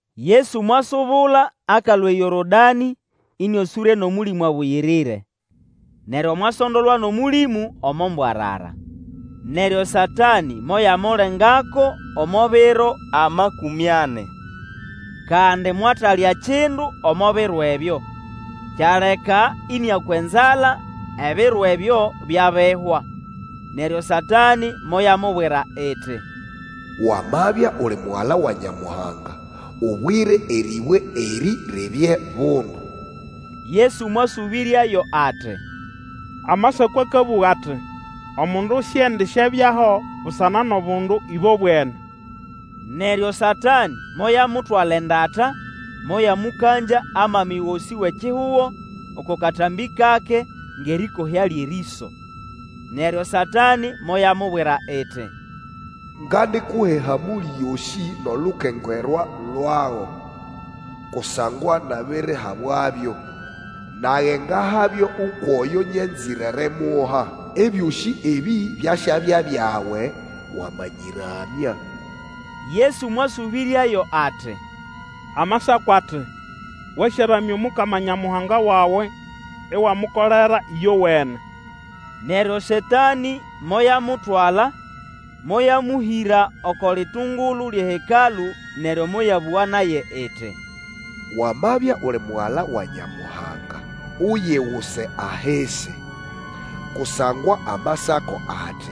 Yesu mwasubula akalũa eYorodanĩ, ĩnĩoswĩre nʼOmũlĩmũ Abũyĩrĩre, neryo mwasondolwa nʼOmũlĩmũ omo mbwarara. Neryo Satanĩ moyamulengako omo biro amakũmĩ ani. Kandi mwatalya kindu omo biro ebyo, kyaleka ĩnĩakwa enzala ebiro ebyo byabihwa. Neryo Satanĩ moyamubwira iti, Wamabya uli Mugala wa Nyamuhanga, ubwire erĩbwe erĩ ribye bundu. Yesu mwasũbĩryayo ati, Amasako akabũga ati, Omundu siendisyabyaho busana nʼobundu ĩbobwene. Neryo Satanĩ moyamutwala endata, moyamũkangya amami gosĩ wʼekihugo oko katambĩ kake ngʼerĩkohya lyʼerĩso. Neryo Satanĩ moyamubwira iti, Ngandikuha ehamũlĩ yosĩ nʼolukengerwa lwago, kusangwa nabirihabwabyo, nage ngahabyo ukwʼoyo nyanzĩre erimuha. Ebyosĩ ebĩ byasyabya byawe, wamanyĩramya. Yesu mwasũbĩryayo ati, Amasako ati, Wasyaramya Omukama Nyamuhanga wawe iwamukolera ĩyowene. Neryo Satanĩ moyamutwala, moyamũhĩra oko litungulu lyʼeHekalũ neryo moyabũga naye iti, Wamabya uli Mugala wa Nyamuhanga, uyiguse ahisi, kusangwa Amasako ati,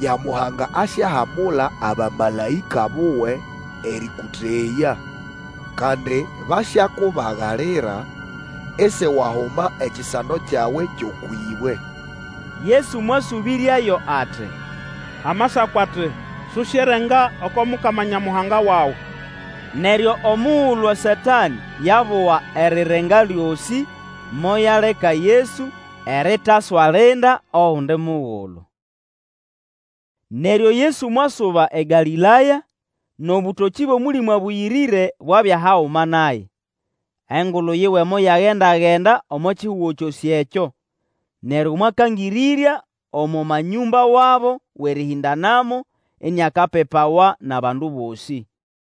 Nyamuhanga asyahamula abamalaĩka buwe erĩkũteya. Kandi, Basyakubagalira, Isiwahuma ekisando kyawe kyʼokwʼĩbwe. Yesu mwasũbĩryayo ati, Amasako ati, Susyerenga oko Mukama Nyamuhanga wawe. Neryo omugulu Satanĩ yabuga erirenga lyosĩ, moyaleka Yesu eritaswalinda ogundi mugulu. Neryo Yesu mwasuba eGalĩlaya, nʼobũtokĩ bwʼOmũlĩmũ Abũyĩrĩre bwabya haguma naye. Engulu yiwe moyagenda-genda omo kihugo kyosĩ ekyo; Neryo mwakangĩrĩrya omo manyũmba wabo wʼerĩhĩndanamo, iniakapipawa nʼabandu bosĩ.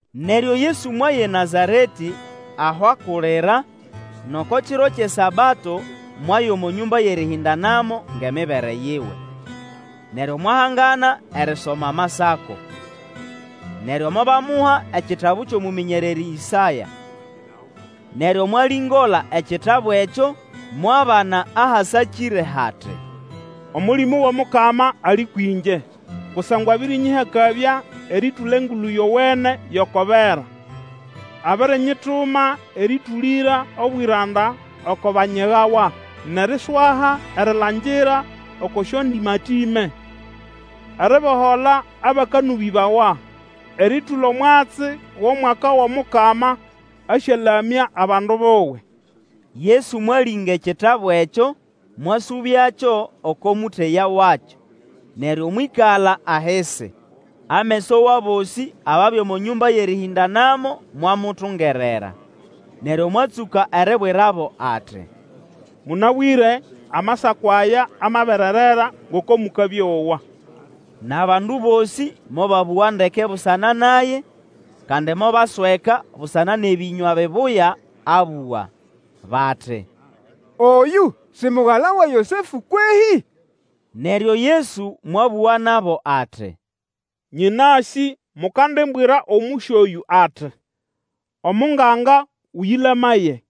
Neryo Yesu mwaya eNazaretĩ aho akulira, nʼoko kiro kyʼeSabato mwaya omo nyũmba yʼerĩhĩndanamo ngʼemibere yiwe. Neryo mwahangana erisoma Amasako. Neryo mobamuha ekitabu kyʼomũmĩnyererĩ Ĩsaya. Neryo mwalĩngola ekitabu ekyo, mwabana ahasakĩre hati, Omũlĩmũ wʼOmukama ali kwĩngye, Kusangwa abĩrĩnyĩhakabya erĩtũla Engulu Yowene yʼoko bera, Abirinyituma erĩtũlĩra obwĩranda oko banyegawa, Nʼeriswaha erilangira oko syondĩmatĩme, Eribohola abakanũbĩbawa, Erĩtũla omwatsi wʼomwaka ogo Mukama asyalamya abandu buwe. Yesu mwalĩnga ekitabu ekyo, mwasũbyakyo oko mũteya wakyo, neryo mwĩkala ahisi. Ameso wʼabosĩ ababya omo nyũmba yʼerĩhĩndanamo mwamutungerera. Neryo mwatsũka eribwirabo ati, Mũnabwĩre Amasako aya amabererera ngoko mũkabĩowa. Nʼabandu bosĩ mobabũga ndeke busana naye, kandi mobasweka busana nʼebĩnywa bibuya abũga. Bati, Oyũ si mugala wa Yosefũ kwehĩ? Neryo Yesu mwabũga nabo ati, Nyĩnasĩ mukandimbwira omũsyo oyũ ati, Omunganga, ũyĩlamaye;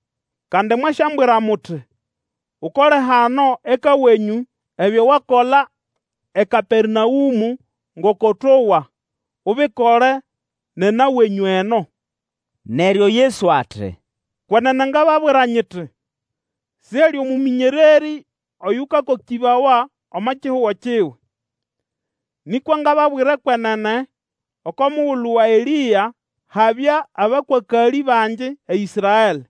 kandi mwasyambwira muti, Ukole hano eka wenyũ, ebyo wakola eKapernaũmũ ngoko towa, ubikole nʼena wenyũ eno. Neryo Yesu ati, Kwenene ngababwira nyiti, Sihali omũmĩnyererĩ oyũkakokĩbawa omo kihugo kiwe. Nĩkwa ngababwira kwenene oko mugulu wa Elĩa, habya abakwakalĩ bangi eĨsraelĩ.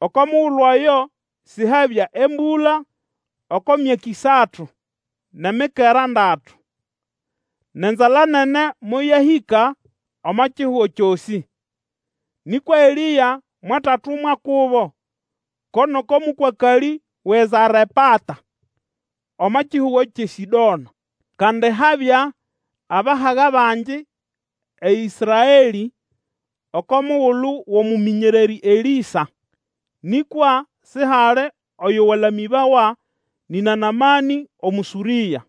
Oko mugulu oyo sihabya embũla oko myaka ĩsatu nʼemikera ndatu, nʼenzala nene moyahĩka omo kihugo kyosĩ. Nĩkwa Elĩa mwatatumwa kubo, ko nʼoko mũkwakalĩ wʼeZarepata, omo kihugo kyʼeSĩdona. Kandi habya abahaga bangi eĨsraelĩ oko mugulu wʼomũmĩnyererĩ Elĩsa; nĩkwa sihali oyo walamĩbawa, nina Namanĩ Omũsũrĩa.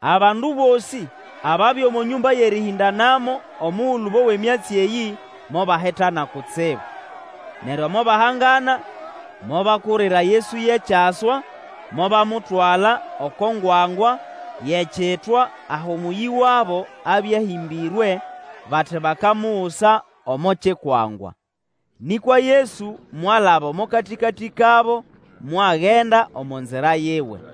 Abandu bosĩ ababya omo nyũmba yʼerĩhĩndanamo omugulu bowa emyatsi eyĩ mobahitana kutsibu. Neryo mobahangana mobakurira Yesu yʼekyaswa, mobamutwala oko ngwangwa yʼekitwa aho mũyĩ wabo abya ahĩmbĩrwe, bati bakamugusa omo kikwangwa. Nĩkwa Yesu mwalaba omo katĩkatĩ kabo mwagenda omo nzira yiwe.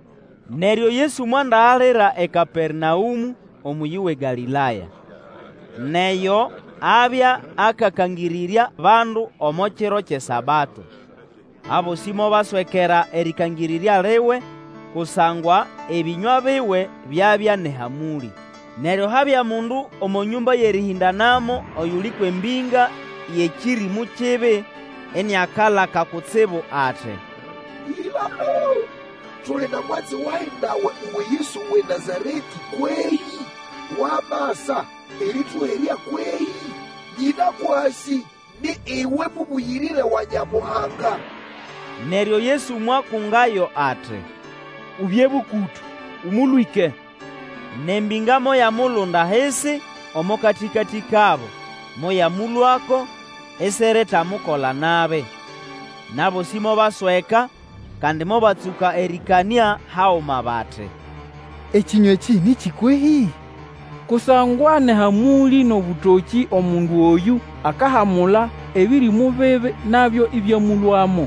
Neryo Yesu mwandagalira eKapernaũmũ, omũyĩ wʼeGalĩlaya. Nʼeyo abya akakangĩrĩrya bandu omo kiro kyʼeSabato. Abosĩ mobaswekera erĩkangĩrĩrya liwe, kusangwa ebĩnywa biwe byabya nʼehamũlĩ. Neryo habya mundu omo nyũmba yʼerĩhĩndanamo oyuli kwʼembĩnga yʼekĩrĩmũ kibi, iniakalaka kutsibu ati, Ĩlolo! Tuli na mwatsi wahi nawe uwe Yesu wʼeNazaretĩ, kwehĩ? Wamasa erĩtũherya kwehĩ? Nyĩnakwasĩ, ni iwe Mũbũyĩrĩre wa Nyamuhanga! Neryo Yesu mwakungayo ati, Ubye bũkũtũ, ũmũlwĩke! Nʼembĩnga moyamulunda ahisi omo katĩkatĩ kabo, moyamũlũako isiritamukola nabi. Nʼabosĩ mobasweka, kandi mobatsũka erĩkanĩa haguma bati, Ekĩnywa ekĩ nĩkĩ kwehĩ? Kusangwa nʼehamũlĩ nʼobũtokĩ omundu oyũ akahamula ebĩrĩmũ bibi, nabyo ĩbyalũamo.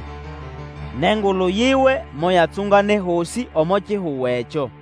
Nʼengulu yiwe moyatsungana ehosĩ omo kihugo ekyo.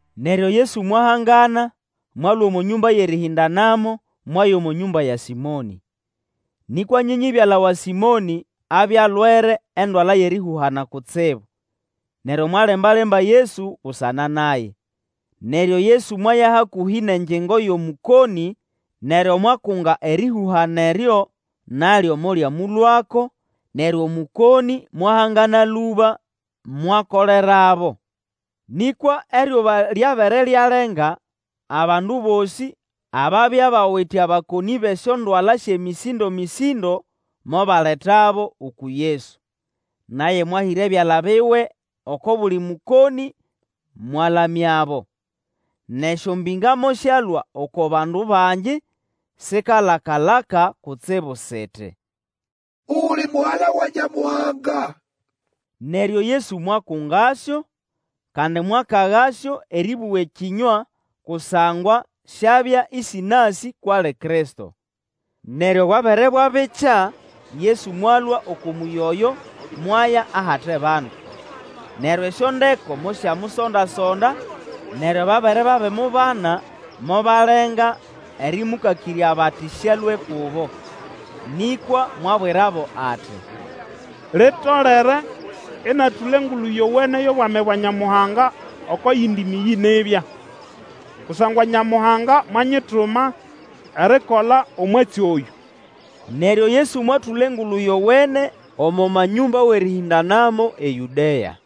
Neryo Yesu mwahangana mwalũa omo nyũmba yʼerĩhĩndanamo, mwaya omo nyũmba ya Sĩmonĩ. Nĩkwa nyĩnyĩbyala wa Sĩmonĩ abya alwere endwala yʼerĩhũhana kutsibu, neryo mwalembalemba Yesu busana naye. Neryo Yesu mwaya hakũhĩ nʼengyingo yʼomũkonĩ, neryo mwakunga erĩhũhana eryo, nalyo molyamũlũako; neryo Omũkonĩ mwahangana lũba, mwakolerabo. Nĩkwa eryuba lyabere lyalenga, abandu bosĩ ababya bawite abakonĩ bʼesyondwala syʼemĩsĩndo-mĩsĩndo mobaletabo uku Yesu; naye mwahĩra ebyala biwe oko buli mũkonĩ mwalamyabo. Nʼesyombĩnga mosyalũa oko bandu bangi, sikalaka-laka kutsibu siti, Uli Mugala wa Nyamuhanga. Neryo Yesu mwakungasyo, kandi mwakagasyo erĩbũga kĩnywa, kusangwa syabya ĩsĩnasĩ kwʼali Kristo. Neryo bwabere bwabikya Yesu mwalũa oko mũyĩ oyo mwaya ahate bandu. Neryo esyondeko mosyamusonda-sonda neryo babere babimubana, mobalenga erĩmũkakĩrya bati sĩalũe kubo. Nĩkwa mwabwirabo ati, Litolere ĩnatũla Engulu Yowene yʼobwami bwa Nyamuhanga oko yindi mĩyĩ nibya, kusangwa Nyamuhanga mwanyituma erikola omwatsi oyũ. Neryo Yesu mwatũla Engulu Yowene omo manyũmba wʼerĩhĩndanamo eYũdea.